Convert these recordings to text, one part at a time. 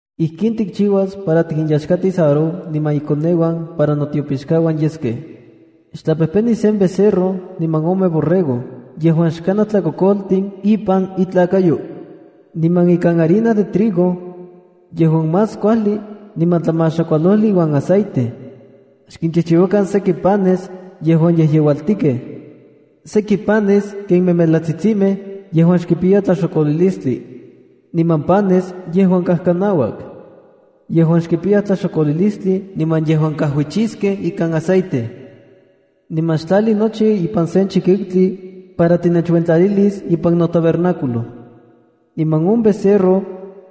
’Ijkin tikchiuas para tikinteyaxkatis Aarón niman ikoneuan para notiopixkauan yeskej. Xtlapejpeni sen becerro niman ome borrego yejuan xkanaj tlakokoltin ipan intlakayo. Niman ikan harina de trigo yejuan más kuajli niman tlamaxakualojli iuan aceite, xchijchiuakan seki panes yejuan yejyeualtikej, seki panes ken memelatsitsimej yejuan xkipiya tlaxokolilistli, niman panes yejuan kajkanauak, yejuan xkipiya tlaxokolilistli niman yejuan kajuichiskej ikan aceite. Niman xtlali nochi pan ipan sen chikiutli, para tinechuentlalilis ipan on tabernáculo. Niman on becerro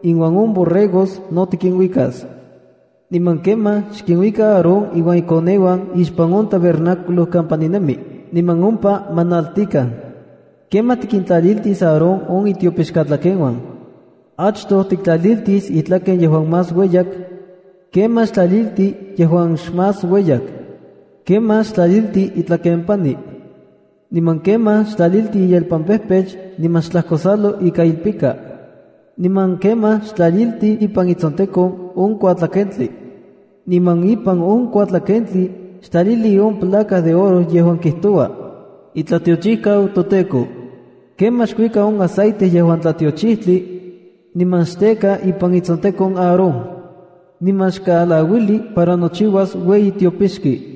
iuan on borregos no tikinuikas. Niman kemaj xkinuika Aarón iuan ikoneuan ixpan on tabernáculo kampa ninemi, niman ompa ma naltikan. ’Kemaj tikintlaliltis Aarón on itiopixkatlakeuan. Achtoj tiktlaliltis itlaken yejuan más ueyak, kemaj xtlalilti on yejuan xmas ueyak. Kemaj xtlalilti itlakempani, niman kemaj xtlalili iyelpampejpech niman xtlajkosalo ika ilpika. Niman kemaj xtlalilti ipan itsontekon on kuatlakentli. Niman ipan on kuatlakentli xtlalili on placa de oro yejuan kijtoua: “ITLATIOCHIJKAU TOTEKO”. Kemaj xkui on aceite yejuan tlatiochijtli, niman xteka ipan itsontekon Aarón, niman xkaalauili para nochiuas ueyi tiopixki.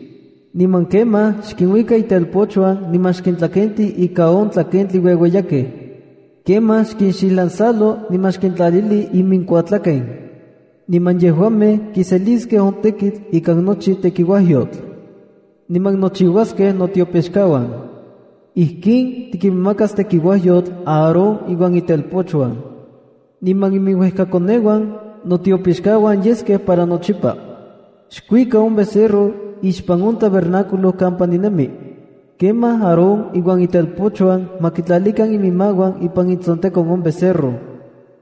Niman kemaj xkinuajuika itelpochuan niman xkintlakenti ika on tlakentin ueueyakej. Kemaj xkinxijlansalo niman xkintlalili iminkuatlaken, niman yejuamej kiseliskej on tekitl ikan nochi tekiuajyotl, niman nochiuaskej notiopixkauan. Ijkin tikinmakas tekiuajyotl Aarón iuan itelpochuan, niman iminuejkakoneuan notiopixkauan yeskej para nochipa. ’Xkuika on becerro ixpan on tabernáculo kampa ninemi. Kemaj Aarón iuan itelpochuan ma kitlalikan iminmauan ipan itsontekon on becerro.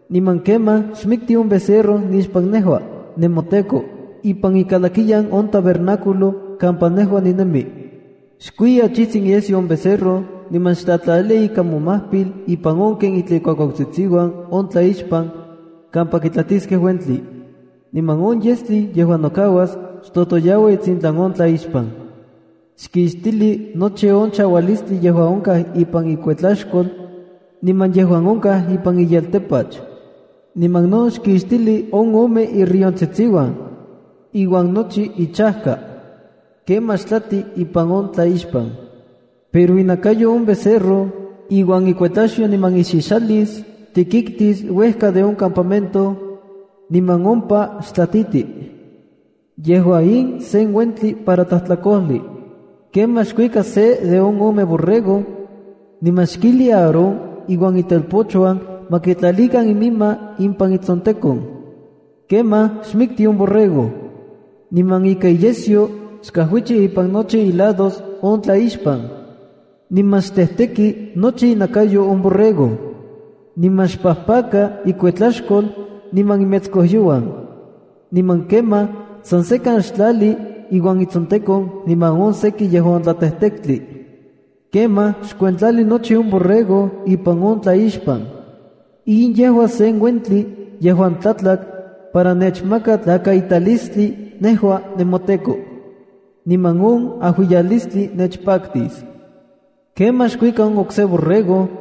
Niman kemaj xmikti on becerro nixpan nejua, nemoTEKO, ipan ikalakiyan on tabernáculo kampa nejua ninemi. Xkui achijtsin iyesyo on becerro, niman xtlalili ika momajpil ipan on ken itlaj ikuakuautsitsiuan on tlaixpan kampa kitlatiskej uentli. Niman on yestli yejuan nokauas, xtotoyaua itsintlan on tlaixpan. Xkixtili nochi on chaualistli yejuan onkaj ipan ikuetlaxkol niman yejuan onkaj ipan iyeltapach, niman no xkixtili on ome irriontsitsiuan iuan nochi ichajka. Kemaj xtlati ipan on tlaixpan. Pero inakayo on becerro, iuan ikuetlaxyo niman ixixalis, tikiktis uejka de on campamento, niman ompa xtlatiti. Yejua in sen uentli para tlajtlakojli. ’Kemaj xkuika se de on ome borrego, niman xkijli Aarón iuan itelpochuan ma kitlalikan iminmauan ipan itsontekon. Kemaj xmikti on borrego, niman ika iyesyo xkajuichi ipan nochi ilados on tlaixpan. Niman xtejteki nochi inakayo on borrego. Niman xpajpaka ikuetlaxkol niman imetskojyouan. Niman kemaj san sekan xtlali iuan itsontekon niman on seki yejuan tlatejtektli. Kemaj xkuentlali nochi on borrego ipan on tlaixpan. In yejua sen uentli yejuan tlatlak para nechmaka tlakaitalistli nejua nemoTEKO, niman on ajuiyalistli nechpaktis. ’Kemaj xkuajuika on okse borrego,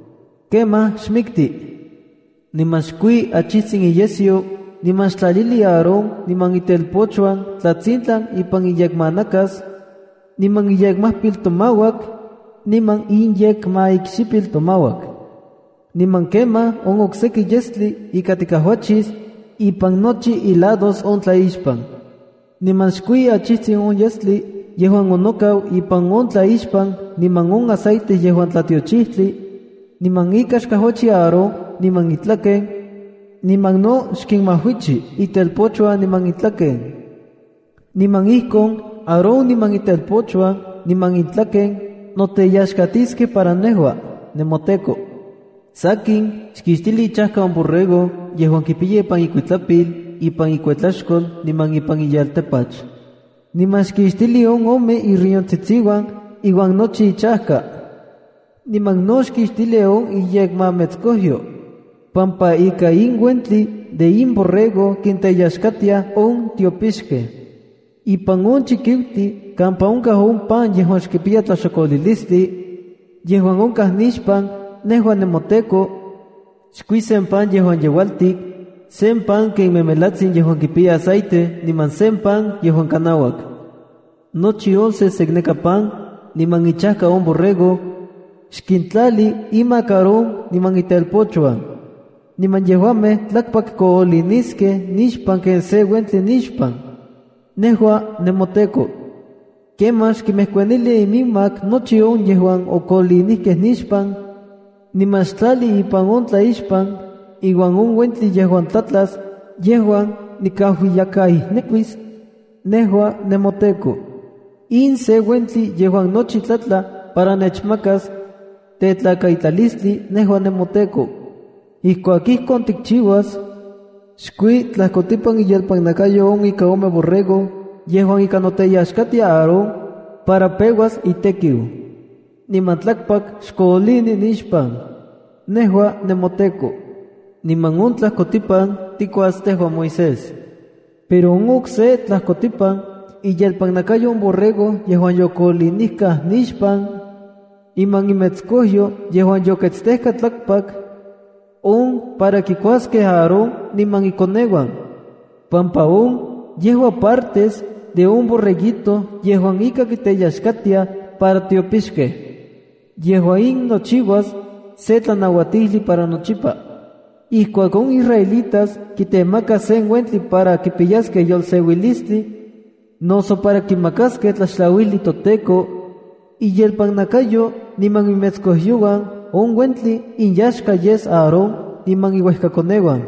Kemaj xmikti, niman xkui achijtsin iyesyo niman xtlalili Aarón niman itelpochuan tlatsintlan ipan inyekmanakas, niman inyekmajpiltomauak, niman inyekmaikxipiltomauak. Niman kemaj on okseki yestli ika tikajuichis ipan nochi ilados on tlaixpan. Niman xkui achijtsin on yestli yejuan onokau ipan on tlaixpan niman on aceite yejuan tlatiochijtli, niman ika xkajuichi Aarón niman itlaken, niman no xkinmajuichi itelpochuan niman intlaken. Niman ijkon Aarón niman itelpochuan niman intlaken noteyaxkatiskej para nejua, nemoTEKO. ’Sakin, xkixtili ichajka on borrego yejuan kipiya ipan ikuitlapil, ipan ikuetlaxkol, niman ipan iyeltapach. Niman xkixtili on ome irriontsitsiuan iuan nochi ichajka. Niman no xkixtili on iyekmametskojyo, pampa ika in uentli de in borrego kinteyaxkatiaj on tiopixkej. Ipan on chikiutli kampa onkaj pan yejuan xkipiya tlaxokolilistli, yejuan onkaj nixpan, nejua nemoTEKO, xkui sen pan yejuan yeualtik, sen pan ken memelatsin yejuan kipiya aceite, niman sen pan yejuan kanauak. Nochi on sesekneka pan, niman ichajka on borrego, xkintlali imak Aarón niman itelpochuan. Niman yejuamej tlakpakkooliniskej nixpan ken se uentli nixpan, nejua nemoTEKO. Kemaj xkinmejkuanili iminmak nochi on yejuan okoolinijkej nixpan, niman xtlali ipan on tlaixpan iuan on uentli yejuan tlatlas yejuan nikajuiyakaijnekuis nejua nemoTEKO. In se uentli yejuan nochi tlatla para nechmaka tetlakaitalistli nejua nemoTEKO. ’Ijkuak ijkon tikchiuas, xkui tlajkotipan iyelpannakayo on ika ome borrego yejuan ika noteyaxkatia Aarón para peuas itekiu, niman tlakpak xkoolini nixpan, nejua nemoTEKO. Niman on tlajkotipan tikuas tejua Moisés. Pero on okse tlajkotipan iyelpannakayo on borrego yejuan yokoolinijkaj nixpan, niman imetskojyo yejuan yoketstejkaj tlakpak, on para kikuaskej Aarón niman ikoneuan, pampa on yejua partes de on borreguito yejuan ika kinteyaxkatiaj para tiopixkej. Yejua in nochiuas se tlanauatijli para nochipa. Ijkuak on israelitas kitemakaj sen uentli para kipiyaskej yolseuilistli noso para kimakaskej tlaxtlauijli toTEKO, iyelpannakayo niman imetskojyouan on uentli inyaxka yes Aarón niman iuejkakoneuana.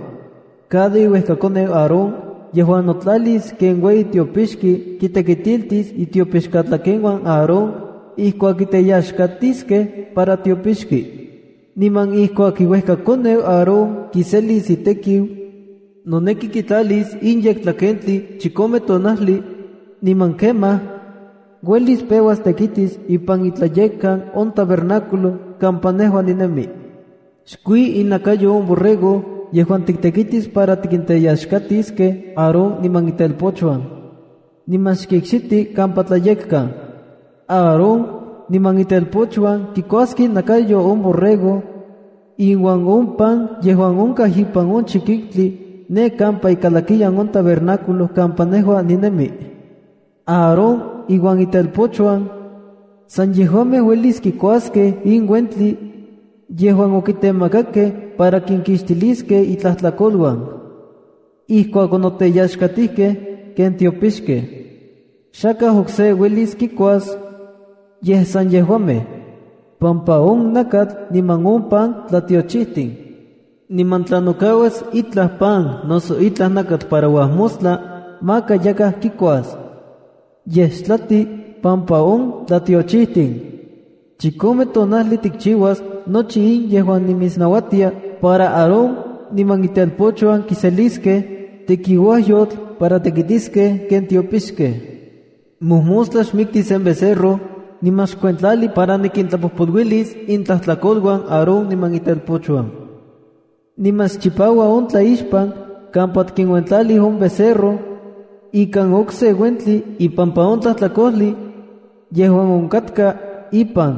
’Cada iuejkakoneu Aarón yejuan notlalis ken ueyi tiopixki kitekitiltis itiopixkatlakeuan Aarón ijkuak kiteyaxkatiskej para tiopixki. Niman ijkuak iuejkakoneu Aarón kiselis itekiu, noneki kitlalis in yektlakentli chikome tonajli, niman kemaj, uelis peuas tekitis ipan iTlayekkan on tabernáculo kampa nejua ninemi. “Xkui inakayo on borrego yejuan tiktetekis para kinteyaxkatiskej Aarón niman itelpochuan, niman xkikxiti kampa tlayekkan. Aarón niman itelpochuan kikuaskej inakayo on borrego iuan on pan yejuan onkaj ipan on chikiutli ne kampa ikalakiyan on tabernáculo kampa nejua ninemi. Aarón iuan itelpochuan, san yejuamej uelis kikuaskej in uentli yejuan okitemakakej para kinkixtilis intlajtlakoluan, ijkuak onoteyaxkatijkej ken tiopixkej. Xakaj okse uelis kikuas, yej san yejuamej, pampa on nakatl niman on pan tlatiochijtin. Niman tla nokauas itlaj pan noso itlaj nakatl para uajmostla, maka yakaj kikuas, yej xtlati pampa on tlatiochijtin. ’Chikome tonajli tikchiuas nochi in yejuan nimitsnauatia para Aarón niman itelpochuan kiseliskej tekiuajyotl para tekitiskej ken tiopixkej. Mojmostla xmikti sen becerro niman xkuentlali para nikintlapojpoluilis intlajtlakoluan Aarón niman itelpochuan. Niman xchipaua on tlaixpan kampa otikuentlalij on becerro ikan okse uentli ipampa on tlajtlakojli yejuan onkatka ipan.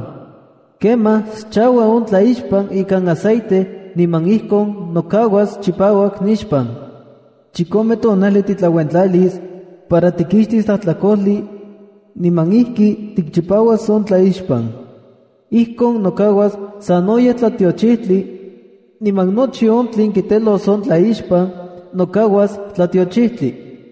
Kemaj xchaua on tlaixpan ikan aceite niman ijkon nokauas chipauak nixpan. Chikome tonajli titlauentlalis para tikixtis tlajtlakojli, niman ijki tikchipauas on tlaixpan. Ijkon nokauas sanoyej tlatiochijtli, niman nochi on tlen kitelos on tlaixpan nokauas tlatiochijtli.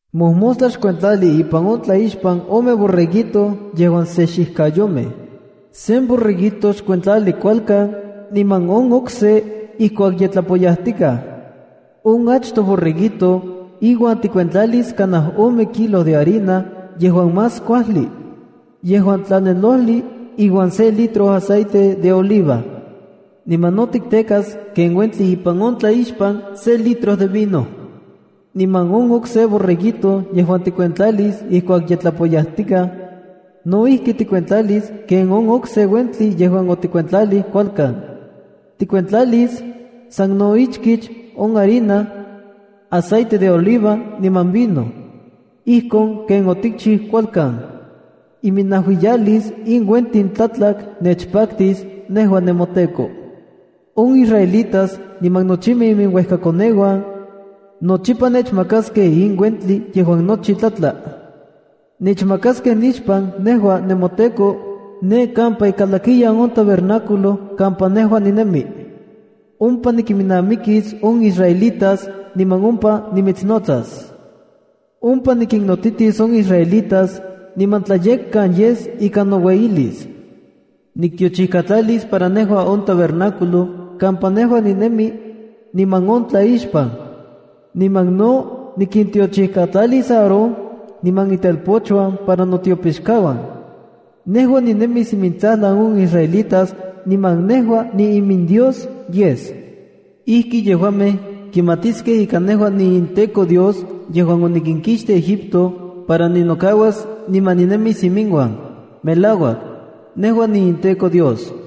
’Mojmostla xkuentlali ipan on tlaixpan ome borreguito yejuan se xijkayomej. Sen borreguito xkuentlali kualkan niman on okse ijkuak ye tlapoyajtikaj. On achtoj borreguito iuan tikuentlalis kanaj ome kilo de harina yejuan más kuajli yejuan tlanelojli iuan se litro de aceite de oliva. Niman no tiktekas ken uentli ipan on tlaixpan se litro vino. Niman on okse borreguito yejuan tikuentlalis ijkuak ye tlapoyajtikaj, no ijki tikuentlalis ken on okse uentli yejuan otikuentlalij kualkan. Tikuentlalis san no ichkich on harina, aceite de oliva niman vino, ijkon ken otikchiu kualkan. Iminajuiyalis in uentin tlatlak nechpaktis nejua nemoTEKO. On israelitas niman nochimej iminuejkakoneuan nochipa nechmakaskej in uentli yejuan nochi tlatla. Nechmakaskej nixpan nejua nemoTEKO ne kampa ikalakiyan on tabernáculo kampa nejua ninemi. Ompa nikiminnamikis on israelitas niman ompa nimitsnotsas. Ompa nikinnotitis on israelitas niman tlayekkan yes ika noueyilis. Niktiochijkatlalis para nejua on tabernáculo kampa nejua ninemi niman on tlaixpan. Niman no nikintiochijkatlalis Aarón niman itelpochuan para notiopixkauan. Nejua ninemis imintsajlan on israelitas, niman nejua niiminDios yes. Ijki yejuamej kimatiskej ika nejua niinTEKO Dios yejuan onikinkixtij Egipto para ninokauas niman ninemis iminuan. Melauak, nejua niinTEKO Dios.